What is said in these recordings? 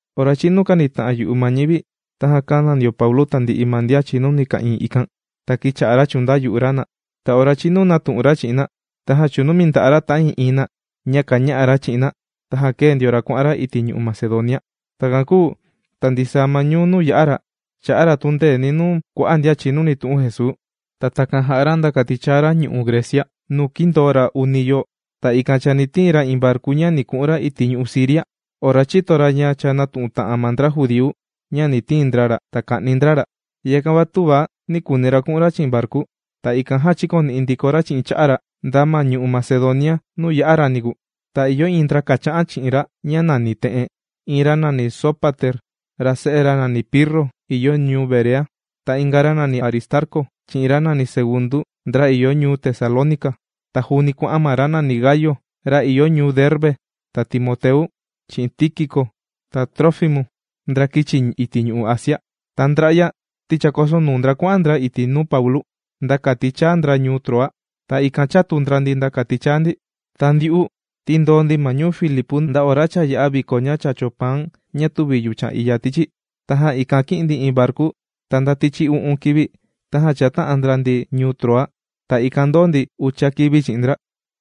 Ora chīnu kānita'an yu'u ma ñivi, tajan kāna ndio Paulu tandi'i ma ndian chìnuni ka'ìin ikan. Ta kīcha'a ra chùndayu'u ra na. Ta ora chīnu nātu'un ra chi'in na, tajan chūnumi nda'a' ra ta'ii'iin na ña kàña'a ra chi'in na, tajan kēe ndio ra kuà'an ra iti' ñu'u' Macedonia. Takan kūu ta ndisaa ma ñuu nuu yà'a ra, chà'a ra tundeeni nuu kua'a' ndian chìnuni tu'un Jesuu. Ta takan jà'a ra nda kati chaa ra ñu'u' Grecia nuu kīndoo ra uni yoo. Ta ikan chani tiin ra iin varku ña ni ku'un ra iti' ñu'u' Siria ora chīto ra ña cha nātu'un ta'an ma ndra judíu ña ni tiin ndra ra ta ka'ni ndra ra. Yakan va töva nī kuuni ra ku'un ra chi'in varku. Ta ikan jan chīkoni'i ndiko ra chi'in cha'a' ra nda ma ñu'u' Macedonia nuu yā'a ra niku. Ta ìyo iin ndra kàcha'an chi'in ra ña nàni te'en: iin ra nàni Sópater, ra se'e ra nàni Pirro ìyo ñuu Berea. Ta inga ra nàni Aristarcu, chi'in ra nàni Segundu, ndra ìyo ñuu Tesalónica. Ta juuni kuà'an ma ra nàni Gayu, ra ìyo ñuu Derbe, ta Timoteu, chi'in Tíkiku, ta Trófimu, ndra kīchi iti' ñu'u' Asia. Ta ndra'ya ti chākosonuu ndra kuà'an ndra iti' nuu Paulu, nda kati chaa ndra ma ñuu Troa. Ta ikan, chātu ndra ndi, nda kati chaa ndi. Ta ndyu'u, ti ndōo ndi ma ñuu Filipu nda ora cha yā'a viko ña chàcho paan ña tüvi yuchan iya tichi. Tajan ikan, kī'in ndi iin varku, ta nda tichi u'un kivi tajan chāta'an ndra ndi ñuu Troa. Ta ikan ndōo ndi ucha kivi chi'in ndra.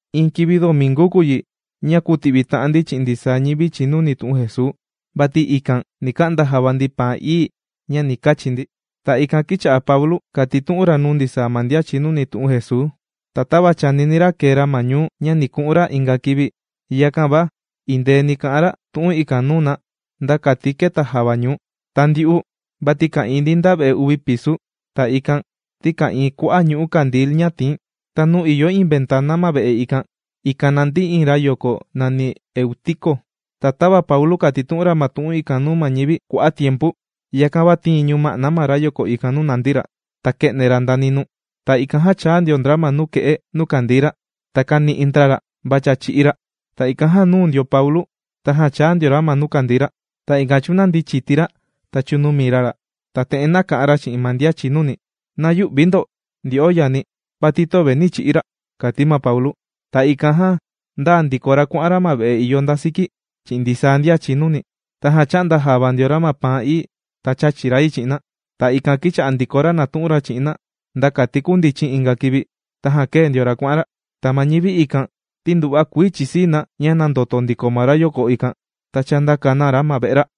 Iin kivi ndomingu kùu yi, ña kūti'vita'an ndi chi'in ndisaa ñivi chìnuni tu'un Jesuu. Vati ikan ni ka'nda java ndi paan ií ña ni kachi ndi. Ta ikan kīcha'a Paulu kàtitu'un ra nuu ndisaa ma ndian chìnuni tu'un Jesuu. Ta tava chànini ra kee ra ma ñuu ña ni ku'un ra inga kivi, yakan va indeeni kà'an ra tu'un ikan nuu na nda kati keta javañuu. Ta ndyu'u vati ka'ìin ndi nda ve'e uvi pisu. Ta ikan ti ka'ìin kua'a' ñu'ú kandil ña tìin. Ta nuu ìyo iin ventana ma ve'e ikan, ikan nàndi iin rayoko nàni Eutico. Ta tava Paulu kàtitu'un ra ma tu'un ikan nuu ma ñivi kua'a' tiempu, yakan va tīin ñuma'na ma rayoko ikan nuu nàndi ra ta kē'ne ra nda ninuu. Ta ikan jan chāa ndio ndra ma nuke'e nuu kàndii ra ta kāni'i ndra ra va cha chī'í ra. Ta ikan jan, nūu ndio ma Paulu, tajan chāa ndio ra nuu kàndii ra. Ta ikan chūnandi chiti ra ta chūnumi ra ra. Ta te'en, nāka'an ra chi'in ma ndian chìnuni: ―¡Na yü'vi ndo, ndyo'o yani, vati töve nī chi'í ra! ―kàti Paulu. Ta ikan jan, ndāa ndiko ra kuà'an ra ma ve'e ìyo nda siki chi'in ndisaa ndian chìnuni. Tajan chā'nda java ndio ra ma paan ií. Ta chāchi ra yi chi'in na. Ta ikan kīcha'a ndiko ra nàtu'un ra chi'in na nda kati kundichin inga kivi. Tajan kēe ndio ra kuà'an ra. Ta ma ñivi ikan ti nduva'a kuii chìsii na ña nāndoto ndiko ma rayoko ikan, ta chāndaka na ra ma ve'e ra.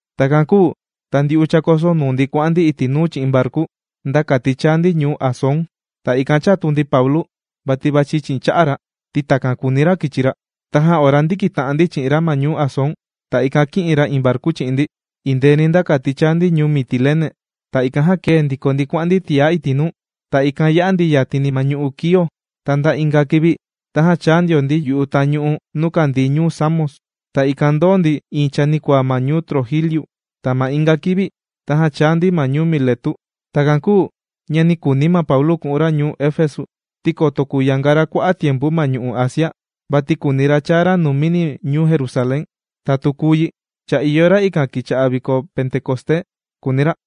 Takan kūu ta ndyu'u chākosonuu ndi kuà'an ndi iti' nuu chi'in varku nda kati chaa ndi ñuu Asón. Ta ikan chātu ndi Paulu vati vàchi chi'in cha'a' ra, ti takan kūuni ra kichi ra. Tajan ora ndīkita'an ndi chi'in ra ma ñuu Asón, ta ikan kī'in ra iin varku chi'in ndi indeeni nda kati chāa ndi ñuu Mitilene. Ta ikan jan kēe ndiko ndi kuà'an ndi tiá iti' nuu, ta ikan yā'a ndi yatini ma ñu'u' Quío. Ta nda inga kivi tajan chāa ndio ndi yu'u tañu'u nuu kàndii ñuu Samos. Ta ikan jan ndōo ndi iin chanikuaa ma ñuu Trogiliu. Ta ma inga kivi, tajan chāa ndi ma ñuu Miletu. Takan kūu ña nī kuuni Paulu ku'un ra ñuu Efesu ti koto kuyanga ra kua'a' tiempu ma ñu'u' Asia. Vati kùuni ra chaa ra numini ñuu Jerusalén. Ta tu kùu yi cha ìyo ra ikan kivi kìcha'a viko Pentecosté, kùuni ra.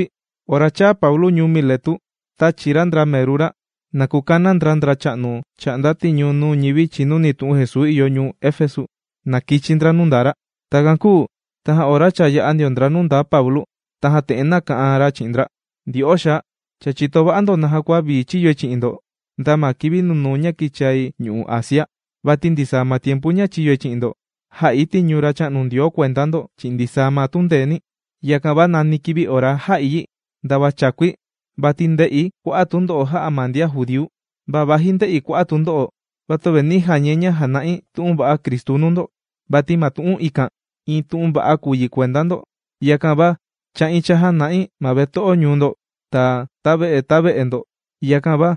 Ora chāa Paulu ñuu Miletu, tāchi ra ndra meru ra na kukana ndra ndracha'nu chà'nda tiñu nuu ñivi chìnuni tu'un Jesuu ìyo ñuu Efesu, na kichi ndra nuu ndaa ra. Takan kūu tajan ora cha chāa ndio ndra nuu ndaa Paulu, tajan te'en nāka'an ra chi'in ndra: ―Ndyo'o xaa, cha chìto va'a ndo naja kua vii chīyoi chi'in ndo nda ma kivi nunuu ña kīchai ñu'u' Asia. Vati ndisaa ma tiempu ña chīyoi chi'in ndo, jā'i tiñu Racha'nu Ndioo kuenda ndo chi'in ndisaa ma tundeeni̱. Yakan va nani kivi ora jā'i yi, ndava chākui, vati ndē'i kua'a' tundo'o jā'a ma ndian judíu. Va vaji ndē'i kua'a' tundo'o, va töve nī jañai ña jàna'i tu'un va'a Cristu nuu ndo. Vati ma tu'un ikan, iin tu'un va'a kùu yi kuenda ndo. Yakan va chà'i chàjana'i ma veto'o ñuu ndo ta ta ve'e ta ve'e ndo. Yakan va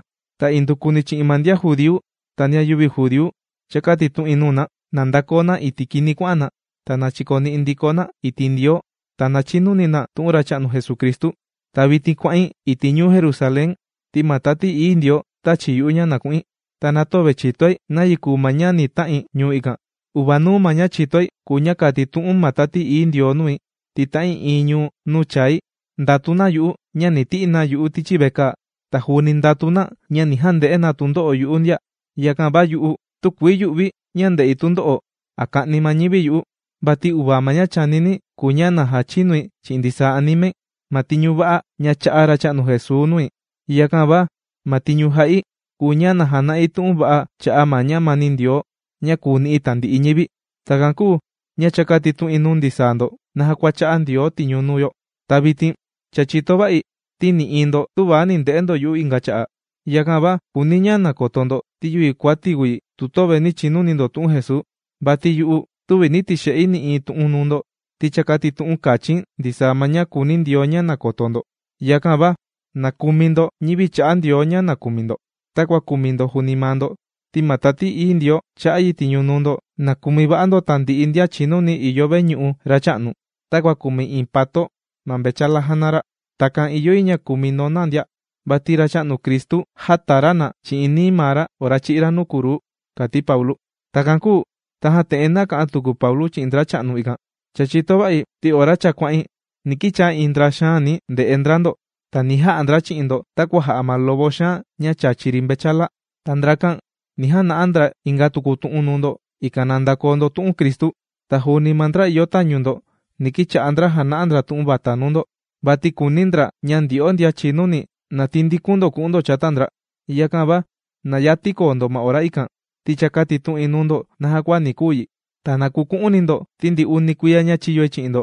indukuni chi'in ma ndian judíu ta ndian yüvi judíu cha kātitu'in nuu na, na ndakoo na iti' kini kuà'an na, ta na chikoni'i ndiko na iti' Ndioo, ta na chinuni na tu'un Racha'nu Jesucristu. Ta vitin kuà'in iti' ñuu Jerusalén ti ma Tati Ií Ndioo, tāchi yu'u ña na ku'in. Ta na töve chìtoi nayi kùu ma ña ta'in ñuu ikan. Uvanuu ma ña chìtoi kùu ña kàtitu'un ma Tati Ií Ndioo nui, ti ta'ii'iin ñuu nuu chài, ndàtu na yu'u ña ni ti'i na yu'u tichi vekaa. Ta juuni ndàtu na ña ni jande'e na tundo'o yu'u ndia. Yakan va yu'u, tükuii yù'vi̱ ña ndè'i tundo'o, a ka'ni ma ñivi yu'u. Vati uvaa ma ña chànini̱ kùu ña na jachinui chi'in ndisaa animai ma tiñu va'a ña chā'a Racha'nu Jesuu nui. Yakan va ma tiñu jà'i kùu ña na jana'i tu'un va'a cha'a' ma ñamani Ndioo ña kùu ni'i tandi'i ñivi. ’Takan kūu ña cha kātitu'in nuu ndisaa ndo naja kua chà'nda Ndioo tiñu nuu yo. Ta vitin cha chìto va'i, ti nï'iin ndo töva ni nde'e ndo yu'u inga cha'a'. Yakan va kùuni̱ ña koto ndo, ti yüvi kuati̱ kùu yi tu töve nī chinuni ndo tu'un Jesuu, vati yu'u, tüvi nī tixe'i nï'iin tu'un nuu ndo ti cha kātitu'un kachi̱n ndisaa ma ña kùuni Ndioo ña koto ndo. Yakan va na kumi ndo ñivi chā'a Ndioo ña kùmi ndo takua kùmi ndo juuni maa ndo, ti ma Tati Ií Ndioo chā'a yi tiñu nuu ndo na kumi va'a ndo tandi'i ndian chìnuni ìyo veñu'u Racha'nu takua kùmi iin pato ma mvechala jàna ra. Takan ìyo yi ña kumi ndo na ndia, vati Racha'nu Cristu jāta ra na chi'in nií maa ra ora chī'í ra nuu kruu ―kàti Paulu. Takan kūu tajan te'en nāka'an tuku Paulu chi'in ndracha'nu ikan: ―Cha chìto va'i, ti ora cha kuà'in, ni kichaa iin ndra xaani nde'e ndra ndo. Ta ni ja'a ndra chi'in ndo takua jà'a ma lobo xaan ña chàchi ri mvechala. Ta ndrakan ni jana'a ndra inga tuku tu'un nuu ndo, ikan na ndakoo ndo tu'un Cristu. Ta juuni ma ndra ìyo tañu ndo, ni kicha'a ndra jana'a ndra tu'un vata nuu ndo, vati kùuni ndra ña ndyo'o ndian chinuni na tandikun ndo ku'un ndo chata ndra. Yakan va na yati koo ndo ora ikan, ti cha kātitu'in nuu ndo naja kua ni kuu yi. Ta na kuku'uni ndo ti ndi uni kuiya ña chīyoi chi'in ndo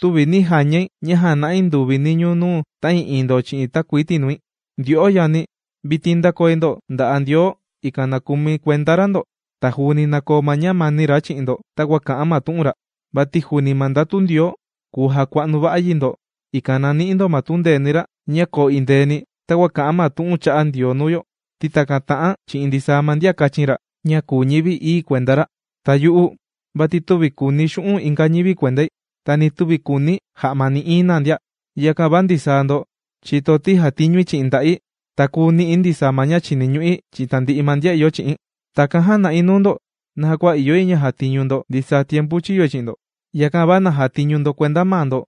tüvi nī jañai ña jàna'i nduvi niñuu nuu ta'ii'iin ndo chi'in takuii tinui. ’Ndyo'o yani, vitin ndàkoi ndo nda'a' Ndioo, ikan na kumi kuenda ra ndo. Ta juuni na koo ma ñamani ra chi'in ndo takua kà'an ma tu'un ra. Vati juuni ma ndatu Ndioo kùu jakua'nu va'a yi ndo, ikan na ni'i ndo ma tundeeni ra ña koo endeeni takua kà'an ma tu'un chā'a Ndioo nuu yo, ti takan tà'an chi'in ndisaa ndian kāchin ra ña kùu ñivi ií kuenda ra. Ta yu'u vati tüvi kùuni̱ xu'un' inga ñivi kuendai, ta ni tüvi kùuni̱ ja'ma nï'iin na ndia. Yakan va ndisaa ndo chìto ti jàtiñui chi'in nda'i, ta kùu ni'i̱ ndisaa ma ña chìniñu'i chi'in tandi'i ma ndian ìyo chi'i̱n. Takan jāna'i nuu ndo naja kua ìyo yi ña jatiñu ndo ndisaa tiempu chìyoi chi'in ndo. Yakan va na jatiñu ndo kuenda maa ndo,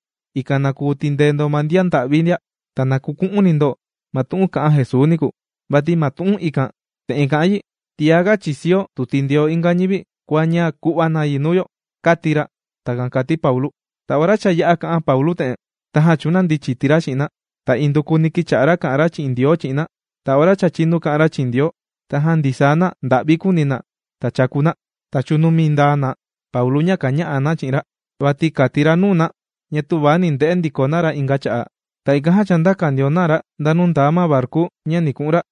ikan na kuu tindee ndo ma ndian nda'vi ndia. Ta na kuku'uni ndo ma tu'un kā'an Jesuu niku. Vati ma tu'un ikan te'en kàti yi: “Tiaga chìsio tu tindeo inga ñivi kua ña ku'va na yi nuu yo”, kāti ra. ―Takan kàti Paulu. Ta ora cha yā'a kà'an Paulu te'en, tajan chūnandi chiti ra chi'in na. Ta indukuni kīcha'a ra kà'an ra chi'in Ndioo chi'in na. Ta ora cha chīnu kà'an na chi'in Ndioo, tajan ndisaa na nda'vi kūuni na, ta chàku na ta chūnumi nda'a' na Paulu ña kàña'a na chi'in ra. Vati kàti ra nuu na ña töva ni nde'e ndiko na ra inga cha'a'. Ta ikan jan chāndaka ndio na ra nda nuu ndaa ma varku ña ni ku'un ra.